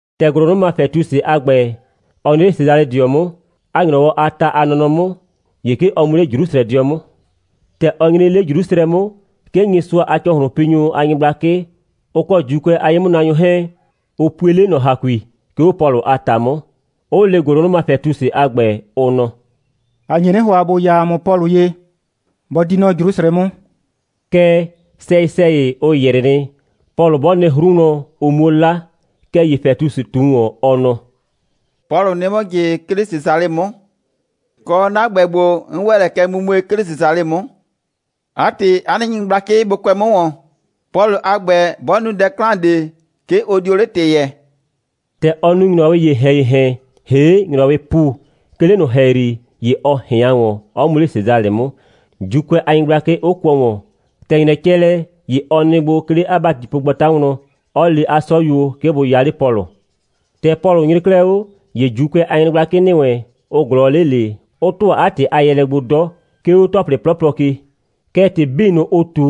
‑Tɛ ‑gʋlʋnʋma Fɛtusɩ a ‑gbɛ, ɔ nyre 'le Sesalɩdɩɔ 'mʋ, 'a ‑nyrɔwɔ a ta a nɔnɔ 'mʋ, ‑ye 'ke ɔ mu 'le Jrusrɛdɩɔ 'mʋ. ‑Tɛ ɔ nyre 'le Jrusrɛ 'mʋ, 'ke Nyɩsʋa a ‑cɔhlʋnpinyʋ a nyɩgblakɩ, ʋ kɔ ‑Juukʋɛ a ye'mʋnaanyʋ 'hɛɛn, ʋ pue 'le ꞊nɔ ‑hakui, 'ke 'o Pɔlʋ a ‑ta 'mʋ, 'ʋ le ‑gʋlʋnʋma Fɛtusɩ a ‑gbɛ, ʋ nɔ: «‑A nye 'nɩ ‑hʋa, ‑bo ya ‑a mʋ Pɔlʋ ye, bɔ di nɔ Jrusrɛ 'mʋ.» Kɛɛ, sɛyɩ‑sɛyɩ, ʋ ‑yrɩ nɩ, Pɔlʋ 'bɔ nɩ 'hru wlɔn, ʋ 'muo 'la. Kɛɛ ‑ye Fɛtusɩ ꞊tu ‑wɔn, ɔ nɔ: «Pɔlʋ nɩ 'mʋ ꞊jɩ, 'ke 'le Sesalɩ 'mʋ. Kɔ, 'na ‑gbɛ ‑gbo, 'n ‑wɛ lɛ kɛ mumue, 'ke 'le Sesalɩ 'mʋ. 'A ‑tɩ, 'a nɩ nyɩgblakɩ bʋ kʋɛ 'mʋ ‑wɔn. Pɔlʋ a ‑gbɛ, 'bɔ nu dɛ 'klan ꞊de, 'ke ʋ dio 'le ‑tɩ yɛɛ.» ‑Tɛ ɔ nu ‑nyrɔwɩɩ ‑yehɛn‑yehɛn ‑hee' ‑nyrɔwɩɩ ‑pu, 'ke 'le ꞊nʋ ‑hɛyri, ‑ye ɔ ꞊hɩan ‑wɔn, 'ɔ mu 'le Sesalɩ 'mʋ, ‑Juukʋɛ a nyɩgblakɩ 'ʋ kʋɔ ‑wɔn. ‑Tɛ ‑nyrɛ cɛ lɛ, ‑ye ɔ nɩ gbo, 'ke 'le 'a ‑batipogbata wlɔn, 'ɔ le 'a 'sɔyuo, 'ke bʋ ya 'le Pɔlʋ. ‑Tɛ Pɔlʋ nyre 'klɛɛ 'o, ‑ye ‑Juukʋɛ a nyɩgblakɩ ‑nɩ wɛn, ʋ ꞊glɔɔ 'le ꞊le, 'ʋ ‑tʋa 'a ‑tɩ a yɛɛlɛ gbo 'dɔ, 'ke 'o ‑tɔplɩ 'plɔplɔ ke. Kɛɛ, ‑tɩ 'bii ꞊nʋ, ʋ ꞊tu,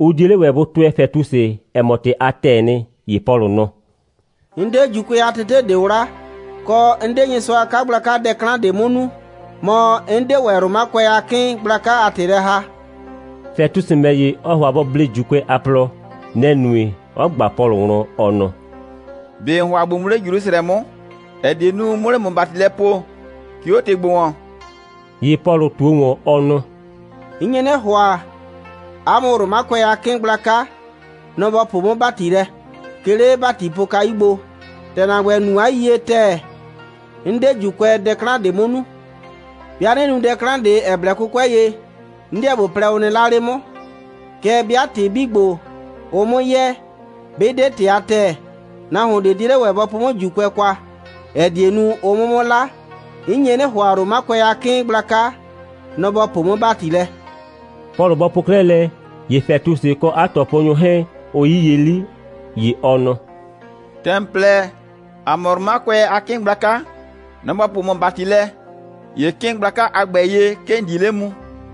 ʋ 'die 'le ‑wɛ bʋ tʋɛ Fɛtusɩ, ‑ɛ mɔ, ‑tɩ a ‑tɛɛ nɩ. ‑Ye Pɔlʋ nɔ: «'N 'de ‑Juukʋɛ a tete ꞊de 'wla, kɔ, 'n 'de Nyɩsʋa a 'kagblaka dɛ 'klan ꞊de 'mʋ nu, mɔ, 'n 'de ‑wɛ Romakʋɛ a 'kɩɩn gblaka a ‑tɩ lɛ ‑haa.» Fɛtusɩ ‑mɛ ‑ye, ɔ ‑hʋa bɔ blee ‑Juukʋɛ a plɔ. Nɛ‑ nue, 'ɔ ꞊gba Pɔlʋ wlɔn, ɔ nɔ: «꞊Be ‑n ‑hʋa ‑bo mu 'le Jrusrɛ 'mʋ, ‑ɛ die nu, 'mʋ 'le ‑mʋ ‑bati lɛ poo, 'ke 'o ‑tɩ ‑gbo ‑wɔn?» ‑Ye Pɔlʋ ꞊tuo ‑wɔn, ɔ nɔ: «'N nye 'nɩ ‑hʋa, 'a mʋ Romakʋɛ a 'kɩɩn gblaka, nɔ‑ ‑bɔ poo 'mʋ ‑bati lɛ, 'ke 'le 'a ‑batipokayu gbo. ‑Tɛ ‑na ‑gbɛ, ‑n nu 'a yiyie ‑tɛɛ, 'n 'de ‑Juukʋɛ dɛ 'klan ꞊de 'mʋ nu. 'Bɩa 'nɩ nu dɛ ꞊de, ‑ɛ blɛ 'kʋkʋɛ ye, 'n 'deɛ ꞊bo plɛ, ʋ nɩ 'la 'le 'mʋ. Kɛɛ, 'bɩa ‑tɩ 'bii ‑gbo, ʋʋ 'mʋ yɛɛ, 'bɩ 'de ‑tɩ a ‑tɛɛ, nahuon ꞊de 'die 'le ‑wɛ bɔ po 'mʋ ‑Juukʋɛ kwa, ‑ɛ die nu, ʋ 'mʋ 'mʋ 'la. 'N nye 'nɩ ‑hʋa, Romakʋɛ a 'kɩɩn gblaka, nɔ‑ ‑bɔ poo 'mʋ ‑bati lɛ.» Pɔlʋ bɔ po 'klɛɛ lɛ, ‑ye Fɛtusɩ, ɔ kɔ 'a ꞊tɔponyʋ 'hɛɛn, ʋ 'yiye 'li, ‑ye ɔ nɔ: «‑Tɛ ‑n plɛ, ‑a mʋ Romakʋɛ a 'kɩɩn gblaka, nɔ‑ ‑bɔ poo ‑mʋ ‑bati lɛ, ‑ye 'kɩɩn gblaka a ‑gbɛ ye, 'ke ‑n di 'le mu.»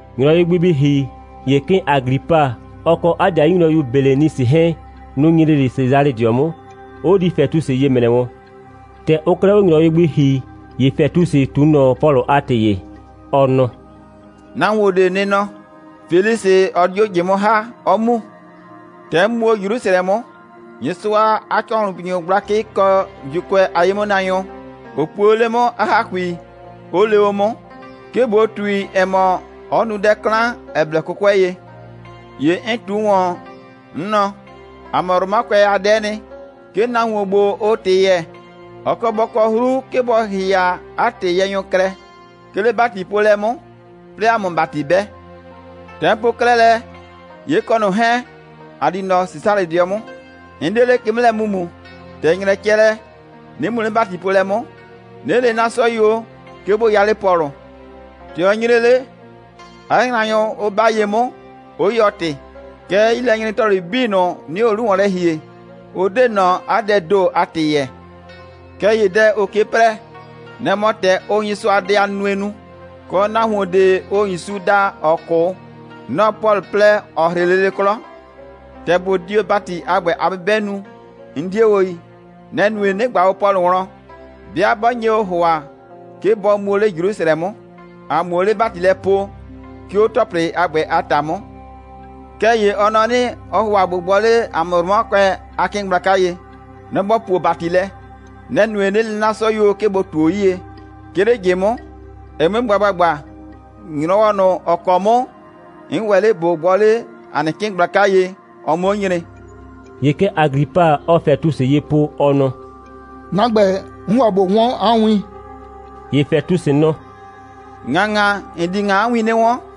‑Nyrɔwɩ gbi bɩ ‑hi, ‑ye 'kɩɩn Aglipa, ɔ kɔ 'a ‑dɩayu nyrɔyu Belenisɩ 'hɛɛn, nʋ‑ nyre 'le Sesalɩdɩɔ 'mʋ, 'ʋ di Fɛtusɩ ye ‑mrɛ wɔn. ‑Tɛ ʋʋ 'klɛɛ 'o ‑nyrɔwɩ gbi ‑hi, ‑ye Fɛtusɩ ꞊tu ꞊nɔ Pɔlʋ a ‑tɩ ye, ɔ nɔ: «Nahuon ꞊de nɩ nɔ, Felisɩ 'ɔ 'dio ꞊jɩ 'mʋ ‑ha, 'ɔ mu. ‑Tɛ 'n mu o 'le Jrusrɛ 'mʋ, Nyɩsʋa a ‑cɔhlʋnpinyʋ gblakɩ kɔ ‑Juukʋɛ a ye'mʋnaanyʋ, ʋ pue o 'le 'mʋ 'a ‑hakui, 'ʋ le o 'mʋ, 'ke ꞊bo ꞊tui, ‑ɛ mɔ, ɔ nu dɛ 'klan, ‑ɛ blɛ 'kʋkʋɛ ye. ‑Ye 'n ꞊tu ‑wɔn, 'n nɔ: ‑A mʋ Romakʋɛ a dɛ'ɛ nɩ, 'ke nahuon ‑gbo, ʋʋ ‑tɩ yɛɛ, ɔ kɔ bɔ kɔ 'hru, 'ke bɔ ‑hɩhɩa 'a ‑tɩyɛɛnyʋ klɛ, 'ke 'le ‑batipoolɛ 'mʋ, 'plɩɩ ‑a 'mʋ ‑bati 'bɛ. ‑Tɛ 'n po 'klɛɛ lɛ, ‑ye 'n kɔ ꞊nʋ 'hɛɛn, ꞊a di nɔ Sesalɩdɩɔ 'mʋ. 'N 'de 'le ke 'mʋ lɛ mu ‑mumu, ‑tɛ ‑nyrɛ cɛ lɛ, 'nɩ mu 'le ‑batipoolɛ 'mʋ, 'nɩ le 'na 'sɔyuo, 'ke bʋ ya 'le Pɔlʋ. ‑Tɛ ɔ nyre 'le, 'a yraanyʋ 'ʋ 'ba ye 'mʋ, 'ʋ yɔɔ ‑tɩ. Kɛɛ, 'yilɛnyre‑tɔplɩ 'bii ꞊nʋ, 'nɩɩ o 'lu ‑wɔn lɛ ‑hie, ʋ 'de ꞊nɔ 'a dɛɛ ‑do a ‑tɩ yɛɛ. Kɛɛ ‑ye dɛ ʋʋ ke 'prɛɛ, nɛ‑ mɔ ‑tɛ ʋʋ Nyɩsʋadɛ a nunue nu, kɔ, nahuon ꞊de, ʋʋ ‑Yusu daa, ‑ɔ 'kʋ, nɔ‑ Pɔlʋ plɛ, ‑ɔ 'hrɩ lele 'klɔ. ‑Tɛ ꞊bo di o ‑bati a ‑gbɛ a 'bɩbɛ nu, 'n 'die o yi. Nɛ‑ nue, 'nɩ ꞊gba o Pɔlʋ wlɔn, 'bɩa 'bɔ nye o ‑hʋa, 'ke bɔ mu o 'le Jrusrɛ 'mʋ, ‑a 'muo o 'le ‑bati lɛ poo, 'ke 'o ‑tɔplɩ a ‑gbɛ a ‑ta 'mʋ. Kɛɛ ‑ye ɔ nɔ 'nɩ, ɔɔ ‑hʋa ꞊bo gbɔ 'le ‑a mʋ Romakʋɛ a 'kɩɩn gblaka ye. Nɔ‑ ‑bɔ puo ‑bati lɛ. Nɛ‑ nue, 'nɩ le 'na 'sɔyuo, 'ke bʋ ꞊tuo 'yie, 'ke 'le ꞊jɩ 'mʋ, ɛ 'mue gba ‑gbagba, ‑nyrɔwɔ ꞊nʋ, ‑ɔ kɔ 'mʋ 'n ‑wɛ 'le ꞊bo gbɔ 'le ‑a nɩ 'kɩɩn gblaka ye, ɔ 'mʋ 'o nyre.» ‑Ye kɛ Aglipa, ɔɔ Fɛtusɩ ye po, ɔ nɔ: «'Na ‑gbɛ, 'n ‑hʋa ꞊bo 'wɔn 'a win.» ‑Ye Fɛtusɩ nɔ: «‑Ŋaŋa, ‑n di ‑ŋa 'a win 'nɩ 'wɔn.»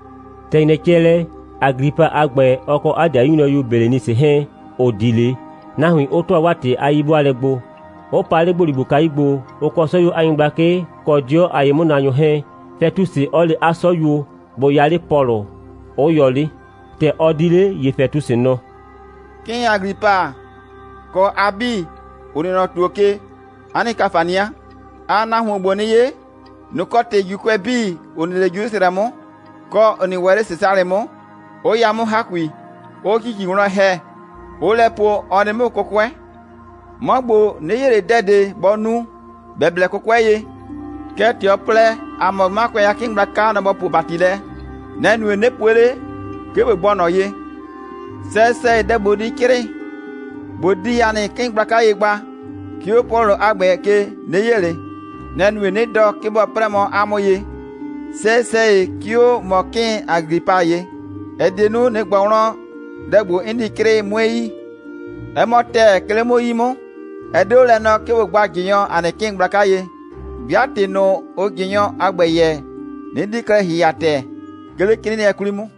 ‑Tɛ ‑nyrɛ cɛ lɛ, Aglipa a ‑gbɛ, kɔ 'a ‑dɩayu nyrɔyu Belenisɩ 'hɛɛn, 'ʋ di 'le, nahuin 'ʋ ‑tʋa 'waa ‑tɩ 'yi'bʋaalɛ gbo, 'ʋ pa 'le ‑gboligbokayu gbo, ʋ kɔ 'sɔyuo a nyɩgblakɩ, kɔ 'dɩɔ a ye'mʋnaanyʋ 'hɛɛn, Fɛtusɩ 'ɔ le 'a 'sɔyuo, bʋ ya 'le Pɔlʋ, 'ʋ yɔ 'le. ‑Tɛ ɔ di 'le, ‑ye Fɛtusɩ nɔ: «'Kɩɩn Aglipa, kɔ a 'bii, ‑ʋ nɩ nɔ ‑tuo ke, 'a nɩ ‑kafania. Aa nahuon ‑gbo 'nɩ 'ye. Nɔ‑ kɔ ‑tɩ ‑Juukʋɛ 'bii, ‑ʋ nɩ 'le Jrusrɛ 'mʋ, kɔ, ‑ʋ nɩ ‑wɛ nɔ Sesalɩ 'mʋ, 'ʋ ya 'mʋ ‑hakui, 'ʋʋ ‑cici wlɔn ‑hɛ, 'ʋʋ lɛ po, ɔ nɩ 'mʋ 'kʋkʋɛ. 'Mɔ ‑gbo, 'nɩ 'ye ꞊le dɛ ꞊de, bɔ nu, ‑bɛ blɛ 'kʋkʋɛ ye. Kɛɛ, ‑tɛ ɔ plɛ, ‑a mʋ Romakʋɛ a 'kɩɩn gblaka, nɔ‑ ‑bɔ puo ‑bati lɛ, nɛ‑ nue, 'nɩ pue 'le, 'ke ꞊bo gbɔ ꞊nɔ ye. Sɛyɩ‑sɛyɩ, dɛ ꞊bo di 'crɩɩ, ꞊bo di ‑a nɩ 'kɩɩn gblaka ye gba, 'ke 'o Pɔlʋ a ‑gbɛ ke, 'nɩ 'ye ꞊le. Nɛ‑ nue, 'nɩ dɔ, 'ke bɔ 'prɛɛ mɔ 'a mʋ ye, sɛyɩ‑sɛyɩ, 'ke 'o ‑mɔ 'kɩɩn Aglipa ye, ‑ɛ die nu, ꞊nɩ ꞊gbɔ wlɔn, dɛ ‑gbo, 'n di 'crɩɩ, 'mue yi. 'Ɛ mɔ ‑tɛɛ, 'ke 'le 'mʋ 'yi 'mʋ, ɛ 'de 'o lɛ nɔɔ, 'ke ꞊bo gba ꞊jɩnyɔ ‑a nɩ 'kɩɩn gblaka ye, 'bɩa ‑tɩ ꞊nʋ, ʋʋ ꞊jɩnyɔ a ‑gbɛ yɛɛ, 'nɩ 'di klɛ ‑hɩhɩa ‑tɛɛ, 'ke 'le 'crɩɩnɩɛ 'kwli 'mʋ.»